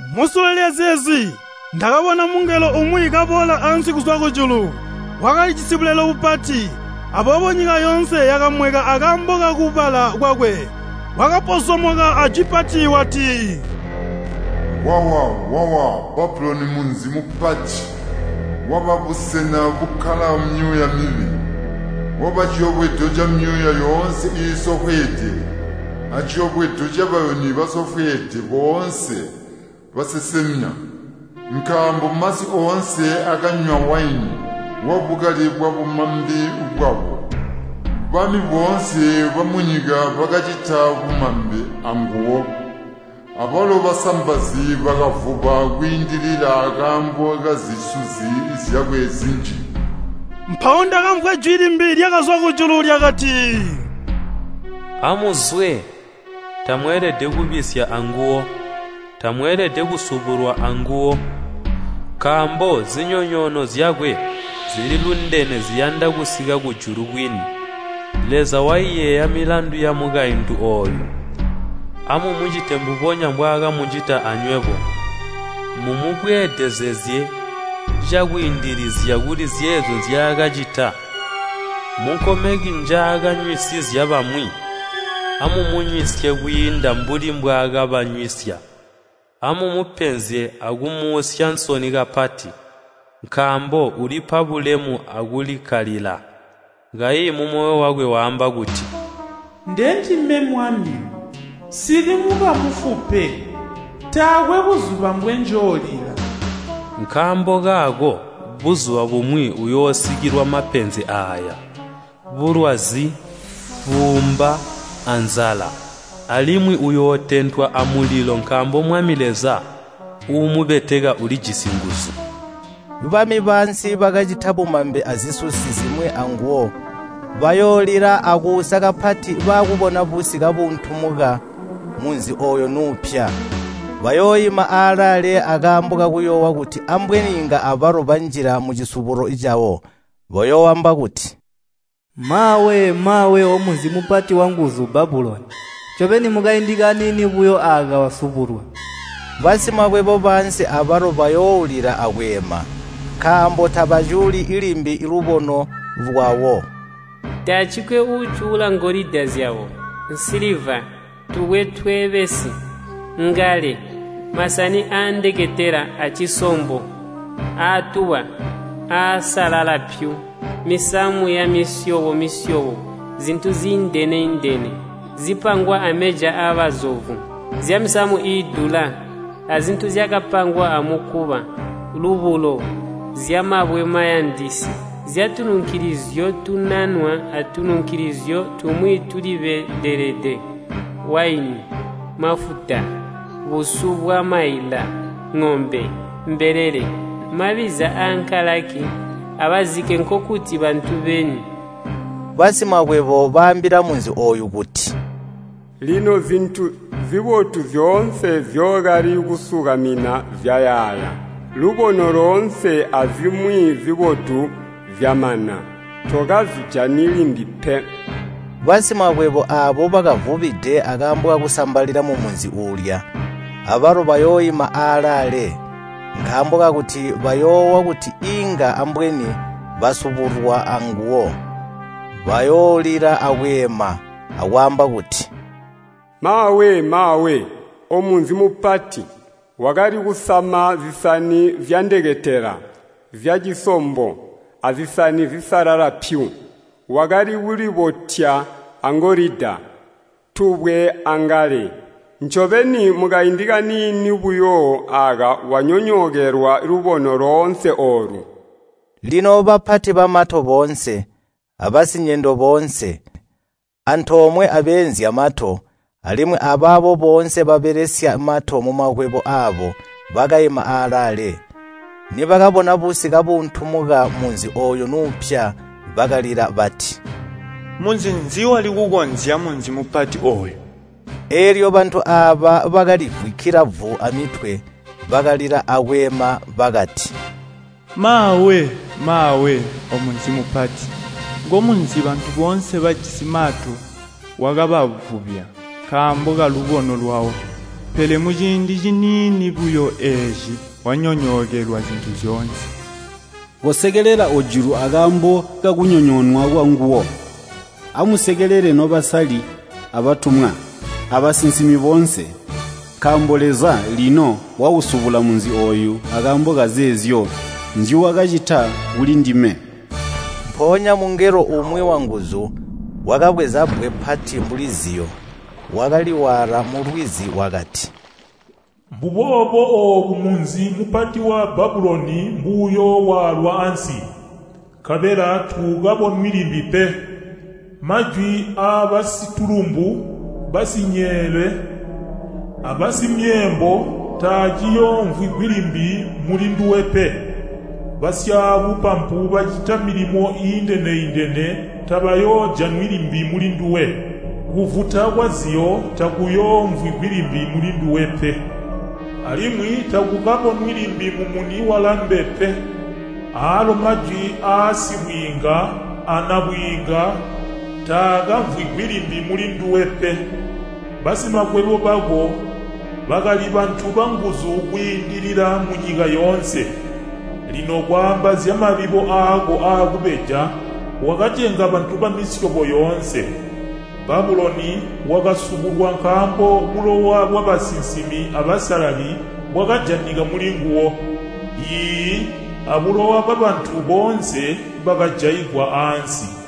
Musule lyazeezi ndakabona mungelo umwi kaboola ansi kuzwa kujulu. Wakalijisi bulelo bupati, aboobo nyika yoonse yakamweka akaambo kakubala kwakwe. Wakapozomoka ajwi pati wati, “Wawa, wawa Babuloni munzi mupati! Waba busena bukkala myuuya mibi! Waba ciyobwedo camyuuya yoonse iisofweede, aciyobwedo cabayuni basofweede boonse, basesemya. Nkaambo masi oonse akanywa waini wabukali bwabumambe bwawo. Bami boonse bamunyika bakacita bumambe anguwo, abalo basambazi bakavuba kwiindilila akaambo kazisusi zyakwe zinji.” Mpawo ndakamvwa jwi limbi lyakazwa kujulu lyakati, “Amuzwe! Tamweelede kubisya anguwo, tamweelede kusubulwa anguwo! Nkaambo zinyonyoono zyakwe zili lundene ziyanda kusika kujulu kwini. Leza waiyeeya milandu yamukaintu ooyu. Amumucite mbubonya mbwaakamucita anywebo, mumubweedezezye cakwiindilizya kuli zeezyo nzyaakacita. Munkomeki njaakanywisizya bamwi amumunywisye kwiinda mbuli mbwaakabanywisya. Amumupenzye akumuusya nsoni kapati, nkaambo ulipa bulemu akulikkalila, kayi mumoyo wakwe waamba kuti, ‘Ndendime mwami, nsili mukamufu pe, taakwe buzuba mbwenjoolila!’ Nkaambo kaako buzuba bumwi uyoosikilwa mapenzi aaya: bulwazi, buumba, anzala, alimwi uyootentwa amulilo nkaambo Mwami Leza uumubeteka ulijisi nguzu.” Bami baansi bakacita bumambe azisusi zimwi anguwo bayoolila akuusa kapati baakubona busi kabuuntumuka munzi ooyo nuupya. Bayooima aalaale akaambo kakuyoowa kuti ambweni inga abalo banjila mucisubulo cawo. Bayooamba kuti “Maawe, maawe omunzi mupati wanguzu Babuloni! Ncobeni mukaindi kaniini buyo aaka wasubulwa!” Basimakwebo baansi abalo bayooulila akweema, nkaambo tabacuuli limbi lubono lwawo. Taacikwe uucuula ngolida zyabo, nsiliva, tubwe tweebesi, ngale, masani aandeketela aacisombo, aatuba, aasalala pyu, misamu yamisyobo-misyobo zintu ziindene-indene zipangwa ameja aabazovu, zyamisamu iidula, azintu zyakapangwa amukuba, lubulo, zyamabwe mayandisi, zyatununkilizyo tunanwa atununkilizyo tumwi tulibedelede, waini, mafuta, busu bwamaila, ŋombe, mbelele, mabbiza ankalaki, abazike nkokuti bantu beni. Basimakwebo baambila munzi ooyu kuti, “Lino zintu zibotu zyoonse nzyookali kusukamina zyayaaya, lubono loonse azimwi zibotu zyamana, tokazijani limbi pe!” Basimakwebo aabo bakavubide akaambo kakusambalila mumunzi uulya, abalo bayooima aalaale, nkaambo kakuti bayoowa kuti inga ambweni basubulwa anguwo. Bayoolila akweema akwaamba kuti, “Maawe, maawe, omunzi mupati! Wakali kusama zisani zyandeketela zyacisombo, azisani zisalala pyu. Wakali kulibotya angolida, tubwe, angale! Ncobeni, mukaindi kaniini buyo aaka wanyonyookelwa lubono loonse oolu!” Lino bapati bamato boonse, abasinyendo boonse, antoomwe abeenzya mato, alimwi abaabo boonse babelesya mato mumakwebo aabo bakaima alaale. Nibakabona busi kabuuntumuka munzi ooyo nuupya bakalila bati, “Munzi nzi wali kukozya munzi mupati ooyu?” Eelyo bantu aaba bakalivwikila vu amitwe, bakalila akweema bakati, “Maawe, maawe omunzi mupati! Ngomunzi bantu boonse bajisi mato wakabavubya nkaambo kalubono lwawo. Pele muciindi ciniini buyo eeci wanyonyookelwa zintu zyoonse!” Kosekelela ojulu akaambo kakunyonyoonwa kwanguwo! Amusekelele nobasalali abatumwa, abasinsimi boonse! Nkaambo Leza lino wausubula munzi ooyu akaambo kazeezyo nzyuwakacita kulindime! Mpoonya mungelo umwi wanguzu wakabweza bbwe pati mbuli ziyo, wakaliwaala mulwizi wakati, “Mbombubo oobu munzi mupati wa Babuloni mbuyoowaalwa ansi, nkabela tuukabonwi limbi pe. Majwi aabasitulumbu, basinyeele, abasimyeembo taaciyoomvwigwi limbi mulinduwe pe! Basyaabupampu bacita milimo iindene-indene tabayoojanwi limbi mulinduwe. Kuvuta kwaziyo takuyoomvwigwi limbi mulinduwe pe! Alimwi takukabonwi limbi mumuni walambe pe, aalo majwi aasibwiinga anabwiinga taakamvwigwi limbi mulinduwe pe. Basimakwebo bako bakali bantu banguzu kwiindilila munyika yoonse. Lino kwaamba zyamabibo aako aakubeja, wakacenga bantu bamisyobo yoonse!” Babuloni wakasubulwa nkaambo bulowa bwabasinsimi abasalali bwakajanika mulinguwo, iiyi, abulowa bwabantu boonse bakajaigwa aansi.